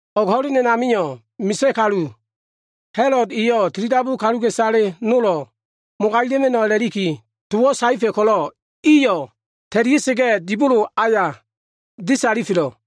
O꞉g ho꞉len a꞉namio꞉, Misa꞉ kalu Ha꞉lod eyo꞉ tilidabu kaluka꞉isale nolo꞉ mogagima꞉no꞉ a꞉la꞉likiyo꞉ towo꞉ saefa꞉ ko꞉lo꞉, iyo꞉ ta꞉lia꞉sa꞉ga꞉ dibolo aya disalifelo꞉.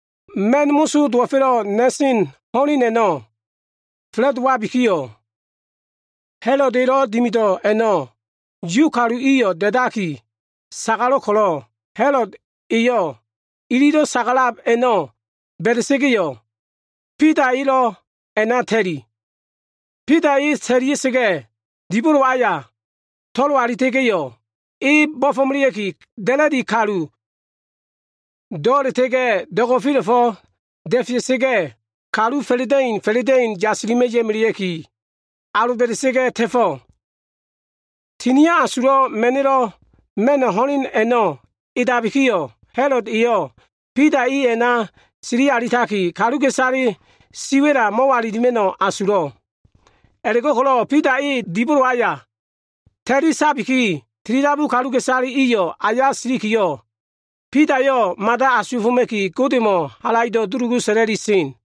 Ma꞉n moso dowo꞉fa꞉lo꞉ na꞉sen ho꞉len a꞉no꞉ fa꞉la꞉dowabikiyo꞉, Ha꞉lod elo꞉ dimido꞉ a꞉no꞉ Yu kalu iyo꞉ da꞉daki sagalo꞉ ko꞉lo꞉, Ha꞉lod eyo꞉ ililo꞉ sagalab a꞉no꞉ ba꞉da꞉sa꞉ga꞉yo꞉, Bida elo꞉ a꞉na ta꞉li. Bida e ta꞉lia꞉sa꞉ga꞉, dibolo aya to꞉lo alita꞉ga꞉yo꞉, e bo꞉fo꞉melea꞉ki, da꞉la꞉di kalu do꞉la꞉ta꞉ga꞉ do꞉go꞉fela꞉fo꞉wo꞉ da꞉fea꞉sa꞉ga꞉, kalu fa꞉la꞉da꞉in fa꞉la꞉da꞉in a꞉la꞉bo꞉ yasilima꞉ ya꞉melea꞉ki, aloba꞉da꞉sa꞉ga꞉ ta꞉felo꞉. Tinio꞉ Asulo꞉ Ma꞉no꞉lo꞉ ma꞉no꞉ ho꞉len a꞉no꞉ edabikiyo꞉, Ha꞉lod eyo꞉ Bida e a꞉na sili alitaki, kaluka꞉isale siwa꞉la mo꞉walilima꞉no꞉ asulo꞉. A꞉la꞉go꞉ko꞉lo꞉ Bida e dibolo aya ta꞉li sabiki, tilidabu kaluka꞉isale iyo꞉ aya silikiyo꞉, Bidayo꞉ mada asuwa꞉foma꞉ki, Godemo꞉ halaido꞉ dulugu sa꞉la꞉li sen.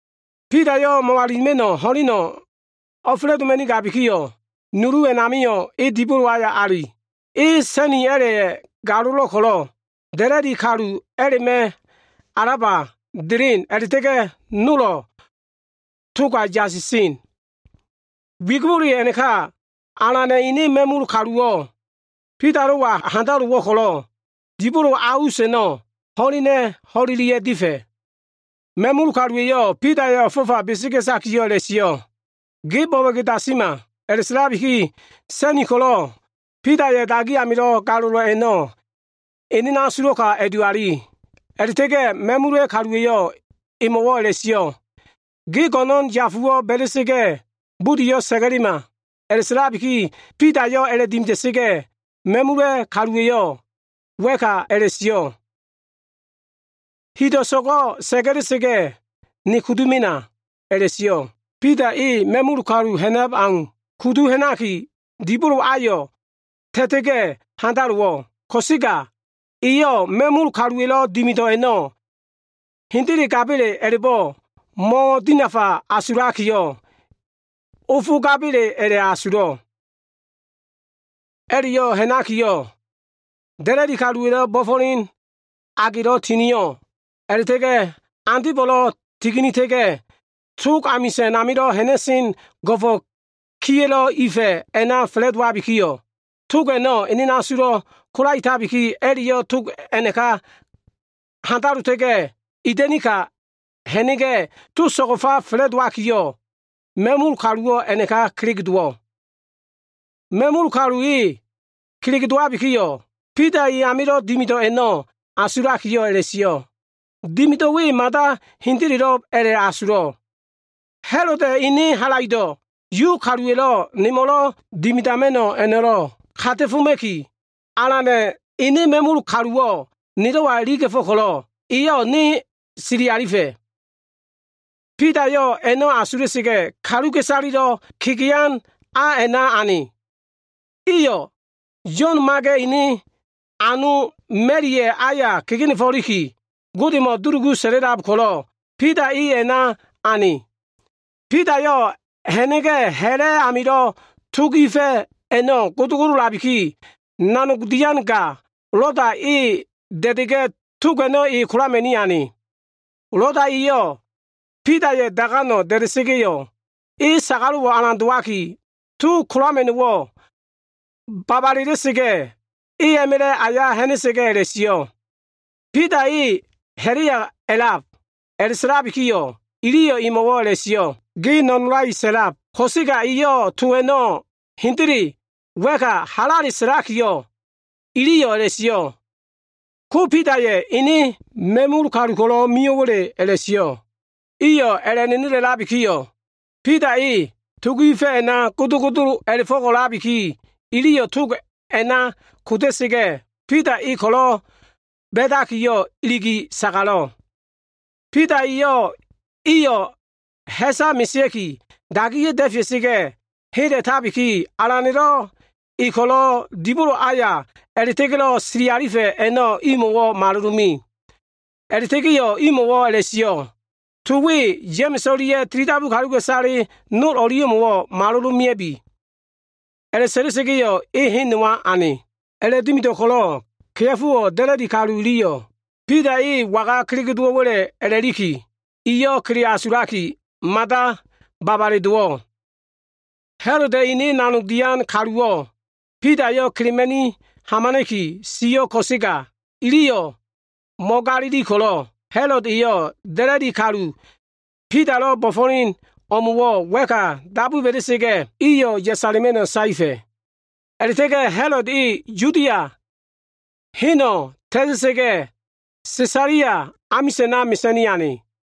Bidayo꞉ mo꞉walilima꞉no꞉ ho꞉leno꞉ o꞉fa꞉la꞉doma꞉nigabikiyo꞉, nulu a꞉namio꞉ e dibolo aya ali. E sa꞉ni a꞉la꞉ya꞉ galolo꞉ ko꞉lo꞉ da꞉la꞉di kalu a꞉la꞉ma꞉ alaba delen a꞉la꞉ta꞉ga꞉ nolo꞉ toga yasisen. Wigibole a꞉naka, Alana꞉ ene ma꞉mul kaluwo꞉ Bidalo꞉wa handalowo꞉ ko꞉lo꞉, dibolo a us a꞉no꞉ ho꞉lena꞉ ho꞉lelia꞉ difa꞉. Ma꞉mul kaluwa꞉yo꞉ Bidaya꞉ o꞉fo꞉fa besega꞉takiyo꞉ a꞉la꞉sio꞉, “Ge bo꞉bo꞉ge dasima.” A꞉la꞉sa꞉labikiyo꞉, sa꞉ni ko꞉lo꞉ Bidaya꞉ dagi amilo꞉ galolo꞉ a꞉no꞉ ene asulo꞉ka a꞉duali. A꞉la꞉ta꞉ga꞉ ma꞉mul kaluwa꞉yo꞉ emo꞉wo꞉ a꞉la꞉sio꞉, “Ge go꞉no꞉n yafuwo꞉ ba꞉la꞉sa꞉ga꞉, budiyo꞉ sa꞉ga꞉lema.” A꞉la꞉sa꞉labiki Bidayo꞉ a꞉la꞉dimida꞉sa꞉ga꞉ dotabikiyo꞉, ma꞉mul kalu eyo꞉ wa꞉ka a꞉la꞉sio꞉, “Hido꞉ so꞉go꞉ sa꞉ga꞉la꞉sa꞉ga꞉, ne kudu mena” a꞉la꞉sio꞉. Bida e ma꞉mul kalu ha꞉nab au kudu ha꞉naki, dibolo ayo꞉ ta꞉ta꞉ga꞉ handalowo꞉. Ko꞉sega eyo꞉ ma꞉mul kaluwa꞉lo꞉ dimido꞉ a꞉no꞉ hendele gab a꞉la꞉bo꞉, e mo꞉dinafa asulakiyo꞉, ofo gaba꞉le a꞉la꞉asulo꞉. A꞉la꞉yo꞉ ha꞉nakiyo꞉, da꞉la꞉diya꞉lo꞉ bo꞉fo꞉len agelo꞉ tinio꞉, a꞉la꞉ta꞉ga꞉ andebo꞉lo꞉ tininita꞉ga꞉, tog amisa꞉n amilo꞉ ha꞉na꞉sen go꞉fo꞉ kiya꞉lo꞉ ifa꞉ a꞉na fa꞉la꞉dowabikiyo꞉, tog a꞉no꞉ ene asulo꞉ kolaetabiki, a꞉la꞉yo꞉ tog a꞉naka handalota꞉ga꞉, ida꞉ni ka ha꞉na꞉ga꞉, tog so꞉go꞉fa fa꞉la꞉dowakiyo꞉, ma꞉mul kaluwo꞉ a꞉na kelege dowo꞉. Ma꞉mul kalu e kelege dowabikiyo꞉, Bida e amilo꞉ dimido꞉ a꞉no꞉ asulakiyo꞉ a꞉la꞉sio꞉, “Dimido꞉ we mada hendelo꞉b a꞉la꞉asulo꞉l. Ha꞉loda꞉ ene halaido꞉ Yu kaluwa꞉yo꞉lo꞉ nemo꞉lo꞉ dimidama꞉no꞉ a꞉no꞉lo꞉ kata꞉foma꞉ki, Alana꞉ ene ma꞉mul kaluwo꞉ nelo꞉wa iliga꞉fo꞉ ko꞉lo꞉, eyo꞉ ne sili alifa꞉.” Bidayo꞉ a꞉no꞉ asula꞉sa꞉ga꞉, kaluka꞉isalelo꞉ kegean a a꞉na ane. Iyo꞉ Yo꞉n Maga꞉ ene ano Maliaya꞉ aya kegenefo꞉liki Godemo꞉ dulugu sa꞉la꞉lab ko꞉lo꞉, Bida e a꞉na ane. Bidayo꞉ ha꞉na꞉ga꞉, ha꞉la꞉ amilo꞉ tog ifa꞉ a꞉no꞉ godogodolabiki, nanog dian ga, Loda, e da꞉da꞉ga꞉, tog a꞉no꞉ e kolama꞉ni ane. Loda eyo꞉ Bidaya꞉ daganko꞉ da꞉da꞉sa꞉ga꞉yo꞉, e sagalo꞉wo꞉ alan dowaki, tog kolama꞉no꞉wo꞉ babalela꞉sa꞉ga꞉, e a꞉ma꞉la꞉ aya ha꞉na꞉sa꞉ga꞉ a꞉la꞉sio꞉, “Bida e ha꞉la꞉ya a꞉lab.” A꞉la꞉sa꞉labikiyo꞉, iliyo꞉ emo꞉wo꞉ a꞉la꞉sio꞉, “Ge no꞉nolai sa꞉lab!” Ko꞉sega eyo꞉ to a꞉no꞉ hendele wa꞉ka halale a꞉sa꞉labikiyo꞉, iliyo꞉ a꞉la꞉sio꞉, “Ko, Bidaya꞉ ene ma꞉mul kalu ko꞉lo꞉ mio꞉wa꞉le?” a꞉la꞉sio꞉. Iyo꞉ a꞉la꞉ nenelelabikiyo꞉, Bida eyo꞉ tog ifa꞉ a꞉no꞉ godogodo a꞉la꞉fo꞉ko꞉labiki, iliyo꞉ togo꞉ a꞉na koda꞉sa꞉ga꞉, Bida e ko꞉lo꞉ ba꞉dakiyo꞉ iligi sagalo꞉. Bida eyo꞉ iyo꞉ ha꞉sa mesea꞉ki, dagiya꞉ da꞉fea꞉sa꞉ga꞉ hela꞉tabiki, Alana꞉lo꞉ e ko꞉lo꞉ dibolo aya a꞉la꞉ta꞉ga꞉lo꞉ sili alifa꞉ a꞉no꞉ imo꞉wo꞉ malolome. A꞉la꞉ta꞉ga꞉yo꞉ imo꞉wo꞉ a꞉la꞉sio꞉, “To we Ya꞉ma꞉s o꞉lia꞉ tilidabu kaluka꞉isale nol o꞉lia꞉mo꞉wo꞉ malolomea꞉bi.” A꞉la꞉sa꞉la꞉sa꞉ga꞉yo꞉, e hen nowa ane. A꞉la꞉dimido꞉ ko꞉lo꞉, kea꞉fowo꞉ da꞉la꞉di kalu iliyo꞉ Bida e waga kelege dowo꞉wa꞉le a꞉la꞉liki, iyo꞉ kele asulakiyo꞉ mada babale dowo꞉. Ha꞉loda꞉ ene nanog dian kaluwo꞉ Bidayo꞉ kelema꞉ni hamana꞉ki sio꞉ ko꞉sega, iliyo꞉ mo꞉galili ko꞉lo꞉, Ha꞉lod eyo꞉ da꞉la꞉di kalu Bidalo꞉ bo꞉fo꞉len o꞉mo꞉wo꞉ wa꞉ka dabu ba꞉da꞉sa꞉ga꞉, iyo꞉ yasala꞉ma꞉no꞉ saefa꞉. A꞉la꞉ta꞉ga꞉ Ha꞉lod e Yudia heno꞉ ta꞉ta꞉sa꞉ga꞉, Sesalia amisa꞉na mesa꞉ni ane.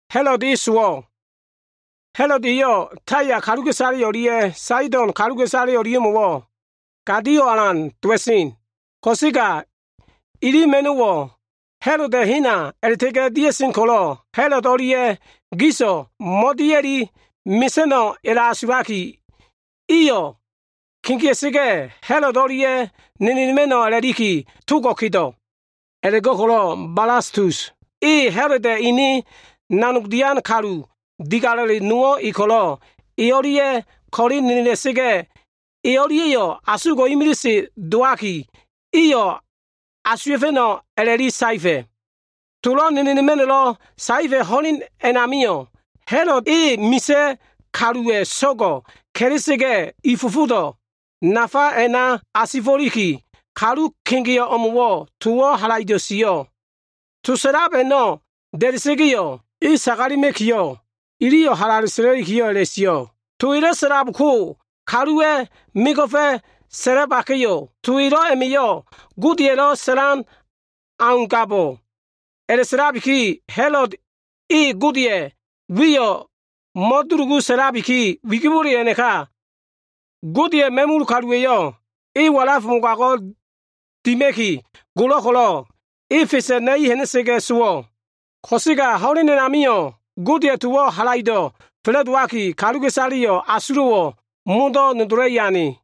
Ha꞉lod eyo꞉ Taya kaluka꞉isale o꞉lia꞉ Saido꞉n kaluka꞉isale o꞉lia꞉mo꞉wo꞉ gadio꞉wo꞉ alan dowa꞉sen. Ko꞉sega iliyo꞉ ma꞉no꞉wo꞉ Ha꞉loda꞉ hena a꞉la꞉ta꞉ga꞉ dia꞉sen ko꞉lo꞉, Ha꞉lod o꞉lia꞉yo꞉ giso꞉ mo꞉dia꞉li mesa꞉no꞉ a꞉la꞉asulaki, iyo꞉ kegea꞉sa꞉ga꞉ Ha꞉lod o꞉lia꞉ nenelema꞉no꞉ a꞉la꞉liki togo꞉ kedo꞉. A꞉la꞉go꞉ko꞉lo꞉ Balastus e Ha꞉loda꞉ ene nanog dian kalu digalo꞉le nowo꞉ e ko꞉lo꞉ e i o꞉lia꞉ ko꞉le nenela꞉la꞉ga꞉, e o꞉lia꞉yo꞉ asugo꞉ imilise dowabiki, iyo꞉ asuwa꞉fa꞉no꞉ a꞉la꞉li saefa꞉. Tolo꞉ nenelema꞉no꞉lo꞉ saefa꞉ ho꞉len a꞉namio꞉, Ha꞉lod e misa꞉ kaluwa꞉ so꞉go꞉ ka꞉la꞉sa꞉ga꞉, i fofodo꞉ nafa a꞉na asifo꞉liki, kalu kegeo꞉ o꞉mo꞉wo꞉ towo꞉ halaido꞉ sio꞉. To sa꞉lab a꞉no꞉ da꞉da꞉sa꞉ga꞉yo꞉, e sagalema꞉kiyo꞉, iliyo꞉ halale sa꞉la꞉likiyo꞉ a꞉la꞉sio꞉, “To elo꞉ sa꞉lab ko, kaluwa꞉ mego꞉fa꞉ sa꞉labaka꞉yo꞉ to elo꞉ a꞉ma꞉yo꞉ godeya꞉lo꞉ sa꞉lan augabo꞉.” A꞉la꞉sa꞉labiki Ha꞉lod e Godeya꞉ wiyo꞉ mo꞉dulugu sa꞉labiki, wigibole a꞉naka Godeya꞉ ma꞉mul kaluwa꞉yo꞉ e walaf mogago꞉ dima꞉ki golo꞉ ko꞉lo꞉, e fesa꞉ na꞉i ha꞉na꞉la꞉ga꞉ sowo꞉. Ko꞉sega ho꞉len a꞉namio꞉ Godeya꞉ towo꞉ halaido꞉ fa꞉la꞉dowaki, kaluka꞉isaleyo꞉ asulo꞉wo꞉ modo꞉ nodola꞉i ane.